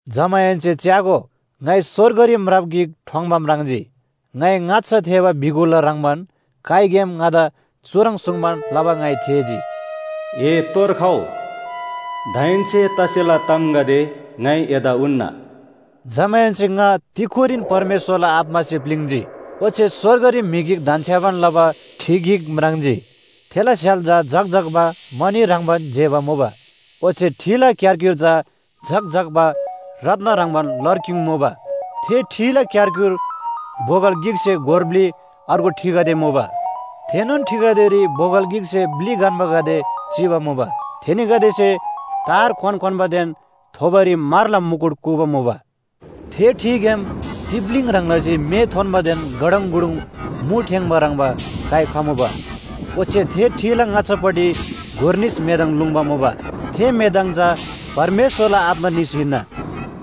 जमाहेन्‍से च्‍यागो, ङाइ स्‍वर्गरी म्राप गिक ठोङ्‌बा म्राङ्जी। ङाइ ङाच्‍छा थेःबा बिगुलला ह्रङ्‌बान काइग्‍याम ङादा चुह्रङ् सुङ्बान लबा ङाइ थेःजी। “ए तोर खउ, दाहेन्‍से तसेला तामगदे ङाइ एदा उन्‍ना।” जमाहेन्‍से ङा तिक्‍खुरीन परमेश्‍वरला आत्‍मासे प्‍लिङ्‌जी। ओच्‍छे स्‍वर्गरी म्‍हि गिक धन्‍छ्‌याबान लबा ठि गिक म्राङ्जी। थेला स्‍य्‍हाल चा झक्‍झक्‍बा मणि ह्रङ्‌बान जेबा मुबा ओच्‍छे ठिला क्‍यारक्‍युर चा झक्‍झक्‍बा रत्‍न ह्रङ्‌बान लरक्‍युङ मुबा। थे ठिला क्‍यारक्‍युर बोगल गिकसे गोर ब्‍लि अर्गु ठिगदे मुबा। थेनोन ठिगदेरी बोगल गिकसे ब्‍लि गन्‍बागदे चिबा मुबा। थेनीगदेसे तार क्‍वान क्‍वान्‍बादेन थोबोरी म्‍हरला मुकुट कूबा मुबा। थे ठिग्‍याम तिप्‍लीङ ह्रङ् लसी मे थोन्‍बादेन गडङगुडुङ मु ठेङ्‌बा ह्रङ्‌बा काइ खमुबा। ओच्‍छे थे ठिला ङाच्‍छापट्टि गोर निस मेदङ लुङ्बा मुबा। थे मेदङ चा परमेश्‍वरला आत्‍मा निस हिन्‍ना।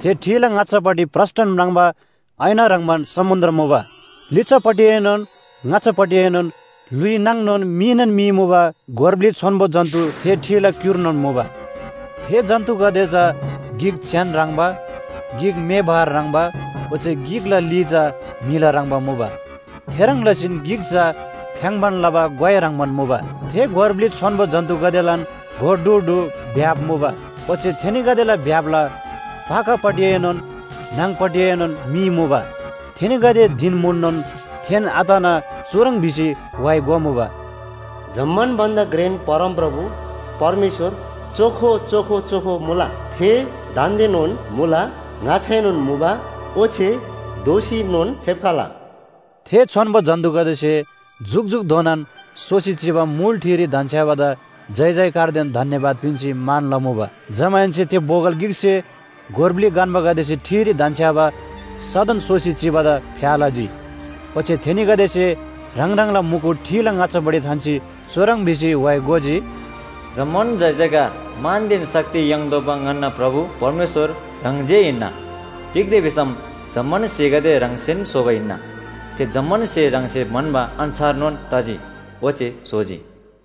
थे ठिला ङाच्‍छापट्टि प्रस्‍टन म्राङ्बा ऐना ह्रङ्‌बान समुन्‍द्र मुबा। लिच्‍छापट्टिएनोन ङाच्‍छापट्टिएनोन ल्‍हुइ नाङनोन मीनोन मी मुबा गोर ब्‍लि छोन्‍बो जन्‍तु थे ठिला क्‍युर्नोन मुबा। थे जन्‍तुगदे चा गिक च्‍यान ह्रङ्‌बा, गिक म्‍हे बहर ह्रङ्‌बा, ओच्‍छे गिकला ली चा म्‍हिला ह्रङ्‌बा मुबा, थेह्रङ् लसीन गिक चा फ्‍याङ्‌बान लबा ग्‍वाइ ह्रङ्‌बान मुबा। थे गोर ब्‍लि छोन्‍बो जन्‍तुगदेलान गोर ढु ढु भ्‍याप मुबा। ओच्‍छे थेनीगदेला भ्‍यापला पाखापट्टिएनोन न्‍हङ‌पट्टिएनोन मी मुबा। थेनीगदे धिन म्‍हुननोन थेन आतना चुह्रङ् भिसी व्‍हाइ गोमुबा, “जम्‍मान भन्‍दा घ्रेन परमप्रभु परमेश्‍वर चोखो, चोखो, चोखो मुला। थे दान्‍देनोन मुला, ङाच्‍छाएनोन मुबा ओच्‍छे दोःसीनोन फेप्‍खला।” थे छोन्‍बो जन्‍तुगदेसे जुकजुकधोनान सोसी चिबा मुल ठिरी धन्‍छ्‌याबादा जयजयकारदेन धन्‍यवाद पिन्‍सी मान लमुबा। जमाहेन्‍से थे बोगल गिकसे गोर ब्‍लि गन्‍बागदेसे ठिरी धन्‍छ्‌याबा सदन सोसी चिबादा फ्‍या लजी। ओच्‍छे थेनीगदेसे ह्राङ ह्राङला मुकुट ठिला ङाच्‍छापट्टि थान्‍सी चुह्रङ् भिसी व्‍हाइ गोजी, “जम्‍मान जयजयकार, मानदेन शक्ति याङ्तोःबा ङन्‍ना प्रभु परमेश्‍वर ह्राङ जे हिन्‍ना। तिग्‍दा भिसम जम्‍मान स्‍हेगदे ह्राङसेन स्‍होबा हिन्‍ना। थे जम्‍मान स्‍हे ह्राङसे म्‍हन्‍बा अन्‍छारनोन तजी, ओच्‍छे स्‍होजी।”